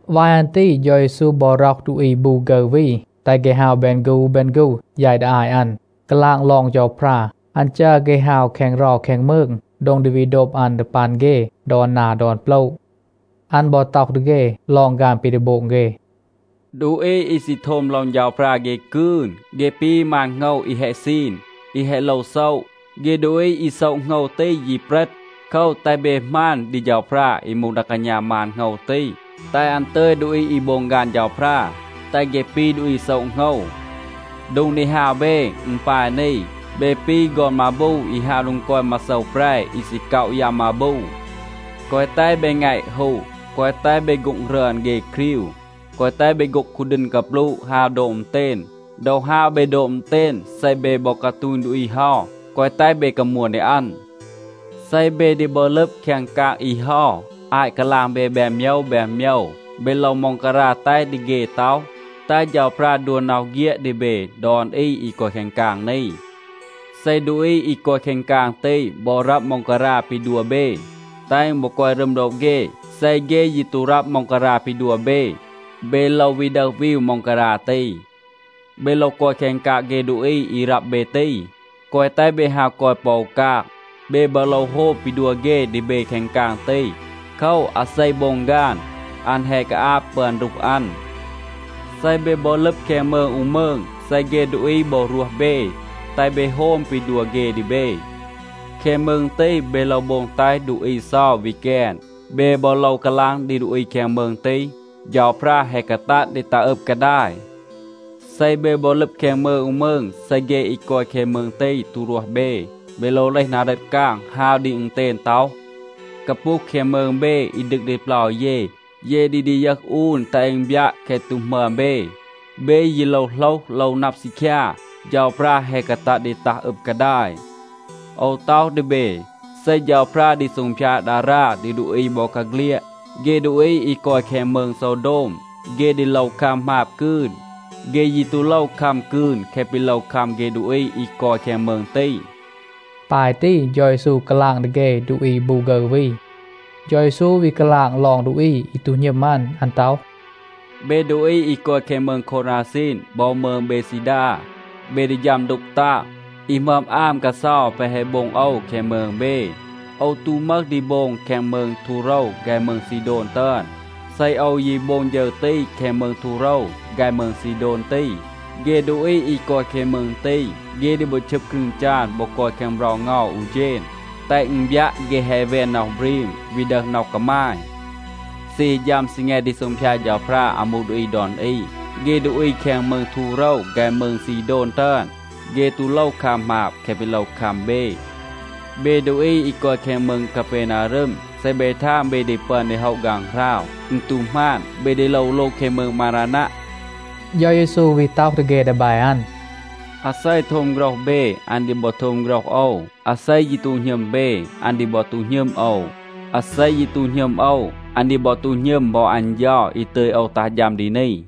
วาย อัน ตี เฌา เยซู บอ ร็อห ดูอี บู ฆึร วี,a แตห เฆ ฮาว แบน ฆู แบน ฆู, แยต ดี อาต อัน, กาลาง ลอง เฌาพรา. อัน จัร เฆ ฮาว แคง เรา แคง มืง, โดง ดี วี โดบ อัน ดี ปัน เฆ ดอน นา ดอน โปละ. อัน บอ ต็อห ดี เฆ ลอง ฆาน ปี ดี โบง เฆ, “ดูอี อี ซี โทม ลอง เฌาพรา เฆ กืน. เฆ ปี มาน โหงว อี แฮะ ซีน, อี แฮะ โลว โซะ. เฆ ดูอี อี โซะ โหงว ตี ยี เปรต. โคว, แตห เบ หมาณ ดี เฌาพรา อี มูห ดา กาณา มาน โหงว ตี, แตห อัน ตึย ดูอี อี โบง ฆาน เฌาพรา, แตห เฆ ปี ดูอี โซะ โหงว. โดง ดี ฮาว เบ, อึณ ปาย นี. เบ ปี ฆอน มาบู อี ฮาว โดง กอย มาโซว แปร อี ซี ก็อะ ยัม มาบู. แกวะ แตห เบ แงะ ฮู, แกวะ แตห เบ โฆ็ง รึอน เฆ ครีว. แกวะ แตห เบ โฆ็ง คูดีณ กาปลูะ, ฮาว โดบ อึณเตณ. ดอ ฮาว เบ โดบ อึณเตณ, เซ เบ บอ กาตูณ ดูอี เฮา, แกวะ แตห เบ กามวน ดี อัน. เซ เบ ดี บอ ลึบ แคง กาง อี เฮา, อาต กาลาง เบ แบน โมยว แบน โมยว, เบ โลว ม็องการา แตห ดี เฆ ต็อห, ‘แตห เฌาพรา ดัว น็อห เฆียด ดี เบ ดอน อี อี กอย แคง กาง นี.’ เซ ดูอี อี กอย แคง กาง ตี บอ รับ ม็องการา ปี ดัว เบ, แตห อึณ บอ กอย รึม โดบ เฆ. เซ เฆ ยี ตู รับ ม็องการา ปี ดัว เบ, เบ โลว วี ดึห วีว ม็องการา ตี. เบ โลว กอย แคง กาง เฆ ดูอี อี รับ เบ ตี. แกวะ แตห เบ ฮาว กอย ปอ อู กาง. เบ บอ โลว โฮม ปี ดัว เฆ ดี เบ แคง กาง ตี. โคว, อาเซ โบง ฆาน, อัน แฮะ กาอาบ ปึอน รูห อัน. เซ เบ บอ ลึบ แคง มืง อู มืง, เซ เฆ ดูอี บอ รวห เบ, แตห เบ โฮม ปี ดัว เฆ ดี เบ. แคง มืง ตี, เบ โลว โบง แตห ดูอี เซา วี แกน. เบ บอ โลว กาลาง ดี ดูอี แคง มืง ตี, ‘เฌาพรา แฮะ กาตัด ดี ตัห อึบ กาดาย.’ เซ เบ บอ ลึบ แคง มืง อู มืง, เซ เฆ อี กอย แคง มืง ตี ตู รวห เบ, เบ โลว เลห นา เรต กาง, ฮาว ดี อึณเตณ ต็อห, ‘กาปูห แคง มืง เบ อี ดึก ดี เปลา เย, เย ดี ดียึห อูน แตห อึณ บยัะ แคะ ตู หมึอม เบ. เบ ยี โลว โหลห, โลว นับ ซีคยา, เฌาพรา แฮะ กาตัด ดี ตัห อึบ กาดาย.’ โอว ต็อห ดี เบ, เซ เฌาพรา ดี ซูงพยาด ดารา ดี ดูอี บอกาเฆลียด, เฆ ดูอี อี กอย แคง มืง โซวโดม, เฆ ดี โลว คัม หมาบ กืน. เฆ ยี ตู โลว คัม กืน แคะ ปี โลว คัม เฆ ดูอี อี กอย แคง มืง ตี.” ปาย ตี เฌา เยซู กาลาง ดี เฆ ดูอี บู ฆึร วี. เฌา เยซู วี กาลาง ลอง ดูอี อี ตู หณึม อัน. อัน ต็อห, “เบ ดูอี อี กอย แคง มืง โควราซีน บอ มืง เบดซีดา, เบ ดี ฌัม ดูก ตาง. อี หมึอม อาม กาเซา แปะ แฮะ โบง โอว แคง มืง เบ, โอว ตู มึห ดี โบง แคง มืง ทูโรว ฆาย มืง ซีโดน ตึอน. เซ โอว ยี โบง ฌึร ตี แคง มืง ทูโรว ฆาย มืง ซีโดน ตี, เฆ ดูอี อี กอย แคง มืง ตี, เฆ ดี บอ ชึบ ครึง จาน บอ กอย แคง เบรา เงา อู เฌณ, แตห อึณ บยัะ, เฆ แฮะ แวน น็อห บรีม, วี ดึห น็อห กามาย. เซ ฮี ฌัม ซีแง ดี ซูงพยาด เฌาพรา อามู ดูอี ดอน อี, เฆ ดูอี แคง มืง ทูโรว ฆาย มืง ซีโดน ตึอน, เฆ ตู โลว คัม หมาบ แคะ ปี โลว คัม เบ. เบ ดูอี อี กอย แคง มืง กาเปนารึม, เซ เบ ทาง เบ ดี ปึอน ดี โฮะ ฆางหราว, อึณ ตู หมาน. เบ ดี โลว โลง แคง มืง มารานัะ.” เฌา เยซู วี ต็อห ดี เฆ ดีแบ อัน, “อาเซ โทม โฆรห เบ, อัน ดี บอ โทม โฆรห โอว. อาเซ ยี ตู หณึม เบ, อัน ดี บอ ตู หณึม โอว. อาเซ ยี ตู หณึม โอว, อัน ดี บอ ตู หณึม บอ อัน เฌา อี ตึย โอว ตัห ฌัม ดี นี.”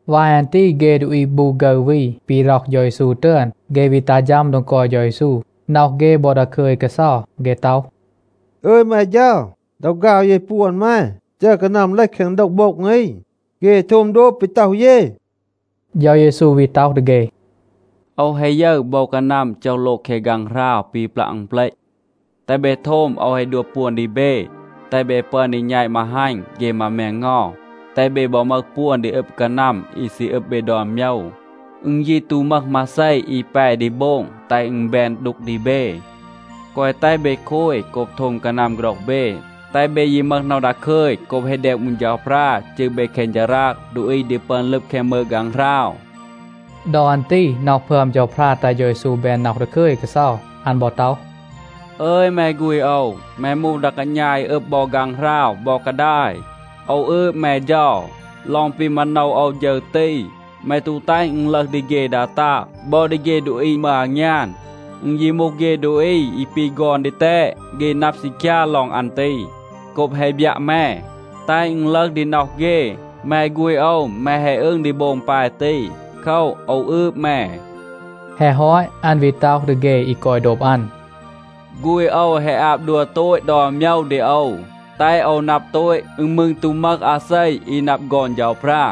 วาย อัน ตี เฆ ดูอี บู ฆึร วี ปี ร็อห เฌา เยซู ตึอน, เฆ วี ตัห ฌัม โดง กอย เฌา เยซู. น็อห เฆ บอ ดาคึย กาเซา. เฆ ต็อห, “อึย แม เฌา, ดอ ฆาว เย ปวน แม, จัร กานัม เลห แคง โดว โบ็ง อี, เฆ แฮะ โทม โดบ ปี ต็อห เย.” เฌา เยซู วี ต็อห ดี เฆ, “โอว แฮะ ยึร โบว กานัม โจห โลง แคง ฆางหราว ปี ปลัะ อึณเปลต. แตห เบ โทม. โอว แฮะ ดัว ปวน ดี เบ, แตห เบ ปึอน ดี แณต มาฮัณ เฆ มา แมงเงา, แตห เบ บอ มึห ปวน ดี อึบ กานัม อี ซี อึบ เบ ดอน โมยว. อึณ ยี ตู มึห มาเซ อี แป ดี โบง แตห อึณ แบน ดูก ดี เบ. แกวะ แตห เบ โคย โกบ โทม กานัม โฆรห เบ. แตห เบ ยี มึห น็อห ดาคึย โกบ แฮะ แดม อูน เฌาพรา จืร เบ แคง ฌาราง ดูอี ดี ปึอน ลึบ แคง มืง ฆางหราว.” ดอ อัน ตี น็อห พึอม เฌาพรา แตห เฌา เยซู แบน น็อห ดาคึย กาเซา. อัน บอ ต็อห, “อึย แม ฆูณ โอว, แม มูห ดา กาณา อี อึบ บอ ฆางหราว บอ กาดาย. โอว อืบ แม เฌา. ลอง ปี มาโนว โอว ฌึร ตี, แม ตู แตห อึณ ลึห ดี เฆ ดา ตาง บอ ดี เฆ ดูอี มึห อางยาน. อึณ ยี มูห เฆ ดูอี อี ปี ฆอน ดีแตด, เฆ นับ ซีคยา ลอง อัน ตี โกบ แฮะ บยัะ แม, แตห อึณ ลึห ดี น็อห เฆ. แม ฆูณ โอว, แม แฮะ อึง ดี โบง ปาย ตี. โคว, โอว อืบ แม.” แฮะ ฮอต อัน วี ต็อห ดี เฆ อี กอย โดบ อัน, “ฆูณ โอว แฮะ อาบ ดัว โตต ดอน โมยว ดี โอว, แตห โอว นับ โตต. อึณ มืร ตู มึห อาเซ อี นับ ฆอน เฌาพรา.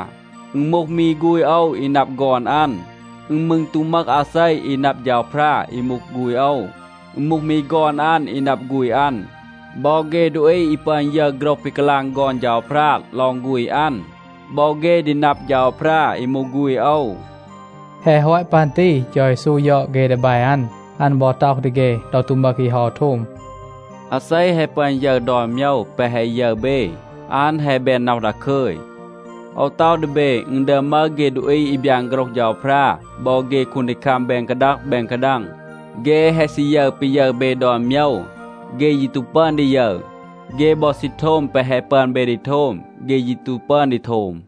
อึณ มูห มี ฆูณ โอว อี นับ ฆอน อัน. อึณ มืร ตู มึห อาเซ อี นับ เฌาพรา อี มูห ฆูณ โอว. อึณ มูห มี ฆอน อัน อี นับ ฆูณ อัน. บอ เฆ ดูอี อี ปึอน ยึร โฆรห ปี กาลาง ฆอน เฌาพรา ลอง ฆูณ อัน, บอ เฆ ดี นับ เฌาพรา, อี มูห ฆูณ โอว.” แฮะ ฮอต ปัน ตี เฌา เยซู ยอด เฆ ดีแบ อัน. อัน บอ ต็อห ดี เฆ ดอ ตู มึห อี เฮา โทม, “อาเซ แฮะ ปึอน ยึร ดอน โมยว แปะ แฮะ ยึร เบ, อัน แฮะ แบน น็อห ดาคึย. โอว ต็อห ดี เบ, อึณ ดึอม มึห เฆ ดูอี อี บยาน โฆรห เฌาพรา บอ เฆ คูนดีคัม แบน กาดัง แบน กาดัง, เฆ แฮะ ซี ยึร ปี ยึร เบ ดอน โมยว. เฆ ยี ตู ปึอน ดี ยึร. เฆ บอ ซี โทม แปะ แฮะ ปึอน เบ ดี โทม, เฆ ยี ตู ปึอน ดี โทม.”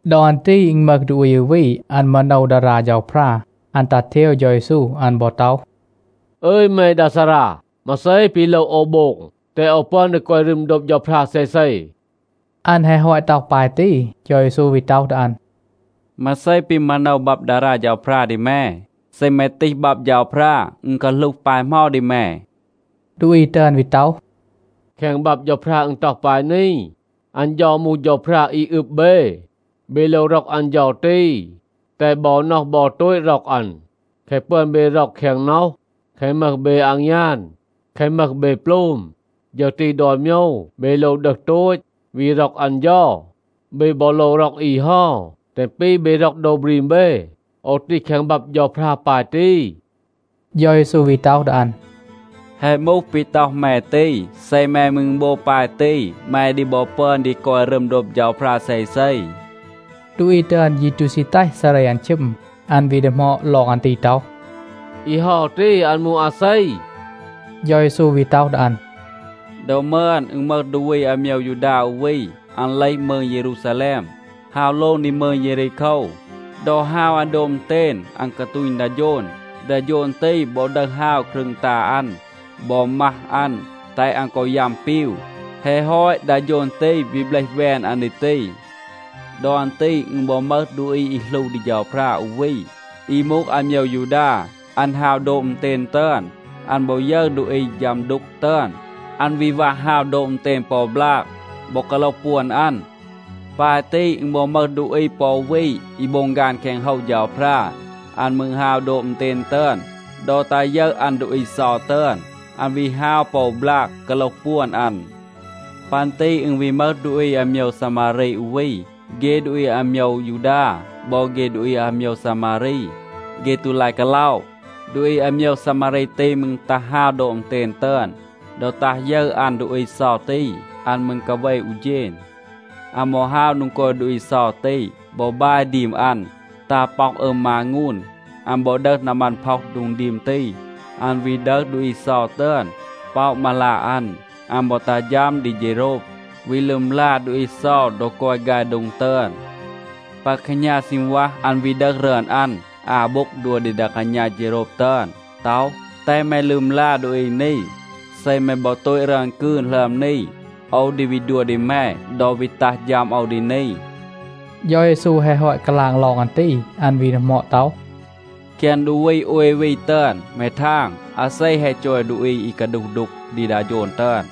ดอ อัน ตี อึณ มึห ดูอี อู วี, อัน มาโนว ดารา เฌาพรา. อัน ตัห เทว เฌา เยซู. อัน บอ ต็อห, “อึย แม ดา ซารา, มาเซ ปี โลว โอว โบง, แตห โอว ปึอน ดี กอย รึม โดบ เฌาพรา เซเซ?” อัน แฮะ ฮอต ต็อห ปาย ตี, เฌา เยซู วี ต็อห ดี อัน, “มาเซ ปี มาโนว บับ ดารา เฌาพรา ดี แม? เซ แม ตีห บับ เฌาพรา, อึณ กาหลูห ปาย เหมา ดี แม?” ดูอี ตึอน วี ต็อห, “แคง บับ เฌาพรา อึณ ต็อห ปาย นี, ‘อัน เฌา มูห เฌาพรา อี อึบ เบ. เบ โลว ร็อก อัน เฌา ตี, แตห บอ น็อห บอ โตต ร็อก อัน. แคะ ปึอน เบ ร็อก แคง น็อห, แคะ มึห เบ อางยาน, แคะ มึห เบ โปลม, ฌึร ตี ดอน โมยว เบ โลว ดึห โตต, วี ร็อก อัน เฌา. เบ บอ โลว ร็อก อี เฮา แตห อึณ ปี เบ ร็อก โดว บรีม เบ.’ โอว ตีห แคง บับ เฌาพรา ปาย ตี.” เฌา เยซู วี ต็อห ดี อัน, “แฮะ มูห ปี ต็อห แม ตี. เซ แม มืร โบง ปาย ตี, แม ดี บอ ปึอน ดี กอย รึม โดบ เฌาพรา เซเซ.” ดูอี ตึอน ยี ตู ซี แตห ซาเร อัน ชึม. อัน วี ดีหมอด ลอง อัน ตี ต็อห, “อี เฮา ตี, อัน มูห อาเซ?” เฌา เยซู วี ต็อห ดี อัน, “ดอ มึอน, อึณ มึห ดูอี อาโมยว ยูดา อู วี. อัน เลห มืง เยรูซาแลม, ฮาว โลง ดี มืง เยรีโคว. ดอ ฮาว อัน โดบ อึณเตณ, อัน กาตูณ ดา โฌน. ดา โฌน ตี บอ ดึห ฮาว ครึง ตา อัน บอ มัห อัน, แตห อัน กอ ยัม ปีว. แฮะ ฮอต, ดา โฌน ตี วี เบลห แวน อัน ดี ตี. ดอ อัน ตี อึณ บอ มึห ดูอี อี หลู ดี เฌาพรา อู วี, อี มูห อาโมยว ยูดา. อัน ฮาว โดบ อึณเตณ ตึอน. อัน บอ ยึร ดูอี ฌัม ดูก ตึอน, อัน วี วัห ฮาว โดบ อึณเตณ ปอ บลาก, บอ กาโลห ปวน อัน. ปาย ตี, อึณ บอ มึห ดูอี ปอ อู วี อี โบง ฆาน แคง โฮว เฌาพรา. อัน มืร ฮาว โดบ อึณเตณ ตึอน. ดอ ตา ยึร อัน ดูอี เซา ตึอน, อัน วี ฮาว ปอ อู บลาก, กาโลห ปวน อัน. ปัน ตี อึณ วี มึห ดูอี อาโมยว ซามารี อู วี. เฆ ดูอี อาโมยว ยูดา บอ เฆ ดูอี อาโมยว ซามารี, เฆ ตู ลาย กาล็อะ. ดูอี อาโมยว ซามารี ตี มืร ตา ฮาว โดบ อึณเตณ ตึอน. ดอ ตัห ยึร อัน ดูอี เซา ตี, อัน มืร กาเว อู เฌณ. อัน บอ ฮาว โดง กอย ดูอี เซา ตี บอ บาย ดีม อัน ตา ป็อห อึม มางูน. อัน บอ ดึห นามัน, พ็อห โดง ดีม ตี. อัน วี ดึห ดูอี เซา ตึอน, ป็อะ มาลา อัน. อัน บอ ตัห ฌัม ดี เฌโรบ, วี ลึมลา ดูอี เซา ดอ กอย ฆาย โดง ตึอน. ปา แคหณา ซีณวัห, อัน วี ดึห รึอน อัน อา โบ็งb ดัว ดี ดา กาณา เฌโรบ ตึอน, ต็อห, ‘แตห แม ลึมลา ดูอี นี. เซ แม บอ โตต รึอน กืน หลึอม นี, โอว ดี วี ดัว ดี แม ดอ วี ตัห ฌัม โอว ดี นี.’” เฌา เยซู แฮะ ฮอต กาลาง ลอง อัน ตี, อัน วี ดีหมอด ต็อห, “แคง ดูอี โอย วี ตึอน, แม ทาง, อาเซ แฮะ จอย ดูอี อี กาดูห ดูก ดี ดา โฌน ตึอน?”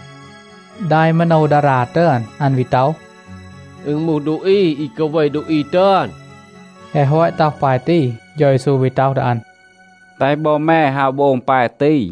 ดา อี มาโนว ดารา ตึอน, อัน วี ต็อห, “อึณ มูห ดูอี อี กาเว ดูอี ตึอน.” แฮะ ฮอต ต็อห ปาย ตี, เฌา เยซู วี ต็อห ดี อัน, “แตห บอ แม ฮาว โบง ปาย ตี.”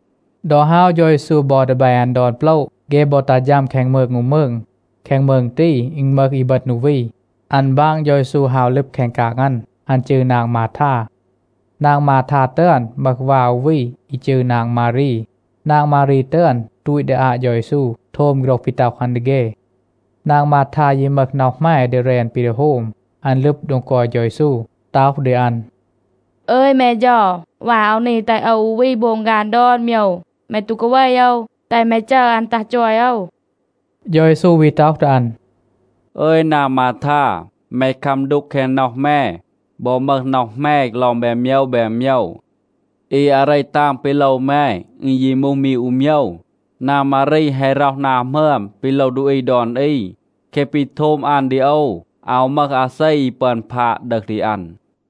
ดอ ฮาว เฌา เยซู บอ ดีแบ อัน ดอน โปละ, เฆ บอ ตัห ฌัม แคง มืง อู มืง. แคง มืง ตี, อึณ มึห อีบึณ อู วี, อัน บาง เฌา เยซู ฮาว ลึบ แคง กาง อัน. อัน จืร นาง มาทา. นาง มาทา ตึอน มึห วา อู วี อี จืร นาง มารี. นาง มารี ตึอน ตูต ดี อาต เฌา เยซู, โทม โฆรห ปี ต็อห อัน ดี เฆ. นาง มาทา ยี มึห น็อห แหม ดี แรน ปี ดี โฮม. อัน ลึบ โดง กอย เฌา เยซู, ต็อห ดี อัน, “อึย แม เฌา, วา โอว นี แตห โอว อู วี โบง ฆาน ดอน โมยว. แม ตู กาเว โอว? แตห แม จัร อัน ตัห จอย โอว.” เฌา เยซู วี ต็อห ดี อัน, “อึย นาง มาทา, แม คัม ดูก แคง น็อห แม บอ มึห น็อห แหม ลอง แบน โมยว แบน โมยว. อี อาเร ตาง ปี โลว แม, อึณ ยี มูห มี อู โมยว. นาง มารี แฮะ ร็อห นา หมึอม ปี โลว ดูอี ดอน อี. แคะ ปี โทม อัน ดี โอว, อาว มึห อาเซ อี ปึอน พาด ดึห ดี อัน.”